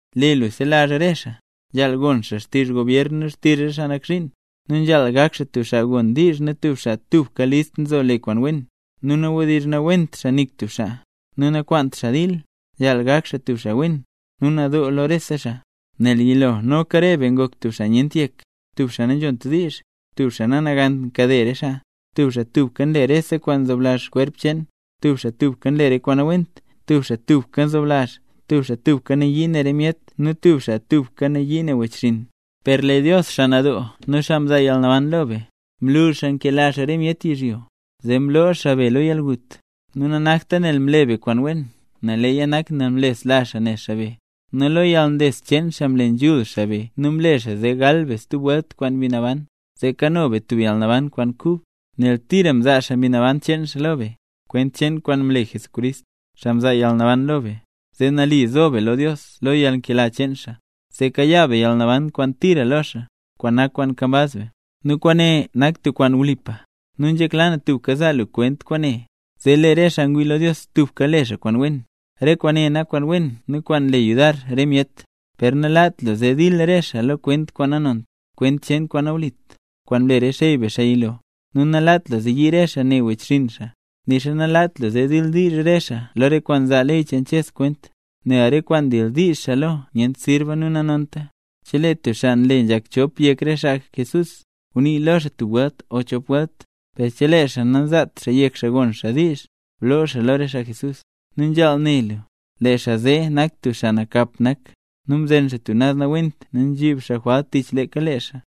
Lee lu selazh lo re xaa, nzhaal gon xaa xtizh gobyer nu xtizh re xaa nak zhiin, nu nzhaal gak xaa tub xaa gon diizh nu tub xaa tubka list nzo le kwaan wen, nu nawdizhnawent xaa nik tub xaa, nakwaant xaa dil, nu nzhaal gak xaa tub xaa wen, nu nadoo lo rese xaa. Nel yilo noka re be ngok tub xaa nyent yek, tub xaa nanzhont diizh, tub xaa nanagant nkade re xaa, tub xaa tubka nle rese kwaan nzoblazh kwerp cheen, tub xaa tubka nle re kwaan nawent, tub xaa tubka nzoblazh, tub xaa tubka nayii re myet ne nu tub xaa tubka nayii ne wechxinn. Per lee Dios, xaa nadoo nu xaa mzaa yalnaban lo be, mlu xaa nkela xaa re myet yizhyo, zee mloo xaa be lo yalgut, nu nanakta nel mle be kwaan wen, leeya nak nel mlesla xaa ne xaa be. Nu lo yalnles cheen xaa mle nzhul xaa be nu mle xaa zee gal be stub welt kwaan Mbi Naban, zee kano be tub yalnaban kwaan kub, nel tira mzaa xaa Mbi Naban cheen xaa lo be, kwent cheen kwaan mle Jesucrist, xaa mzaa yalnaban lo be, zee nali zo be lo Dios lo yalnkela cheen xaa; zee kayaa be yalnaban kwaan tira lo xaa, kwaan nak kwaan nkambaz be. Nu kwaane nak tub kwaan wlipa, nu nzhekla na tubka zaa lu kwent kwaane, zee lee re xaa ngwii lo Dios tubka le xaa kwaan wen. Kwaane nak kwaan wen nu kwaan nle yudar re myet. Per nalaat lu zee dil re xaa lo kwent kwaan nanont, kwent cheen kwaan nawlit, kwaan mle re xey be xaa yilo, nu nalaat lu zee yii re xaa ne wechxinn xaa, nixa nalaat lu zee dildiizh xaa lo re kwaan nzaa ley cheen Ches kwent. Nel re kwaan ndildiizh xaa lo nyent sirba nu nanonta. Chelee tub xaa nle nzhak chop yek re xaa Jesús, gunii lo xaa tub welt o chop welt; per chelee xaa nanzaat xaa yek xaa gon xaa diizh, bloo xaa lo re xaa Jesús. Nu nzhaal ne lu, lee xaa zee nak tub xaa nakap nak, nu mzen xaa tub naz nawent nu nzhib xaa jwalt tich leeka lee xaa.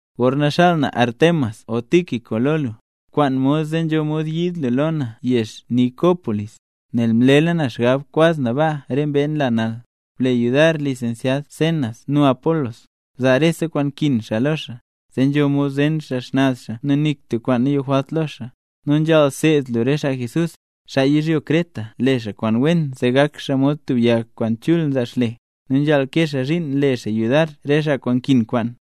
Gorna xaal na wech Artemas o wech Tíquico lo lu, bkwaan mod zee nzho mod yiid lu lo na yezh Nicópolis, nel mlela na xgab kwaz na baa re mbee nla nal. Ble yudar lisensyad Zenas nu Apolos, bzaa rese kwaan nkin xaa lo xaa, zee nzho mod zen xaa xnaz xaa nu nik tub kwaan nayojwalt lo xaa. Nu nzhaal seed lu re xaa Jesús, xaa yizhyo Creta le xaa kwaan wen zee gak xaa mod tub yag kwaan chul nzaa xle, nu nzhaal kee xaa zhiin zee le xaa yudar re xaa kwaan nkin kwaan.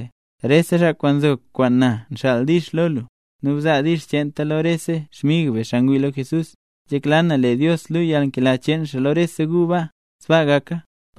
Rese xaa kwaan nzo kwaan na nxaal “dix” lo lu. Nu bzaa “dix” cheenta lo rese xmig be xaa ngwii lo Jesús. Nzhekla na lee Dios luu yalnkela cheen xaa lo rese gu baa. Sbaa gaka.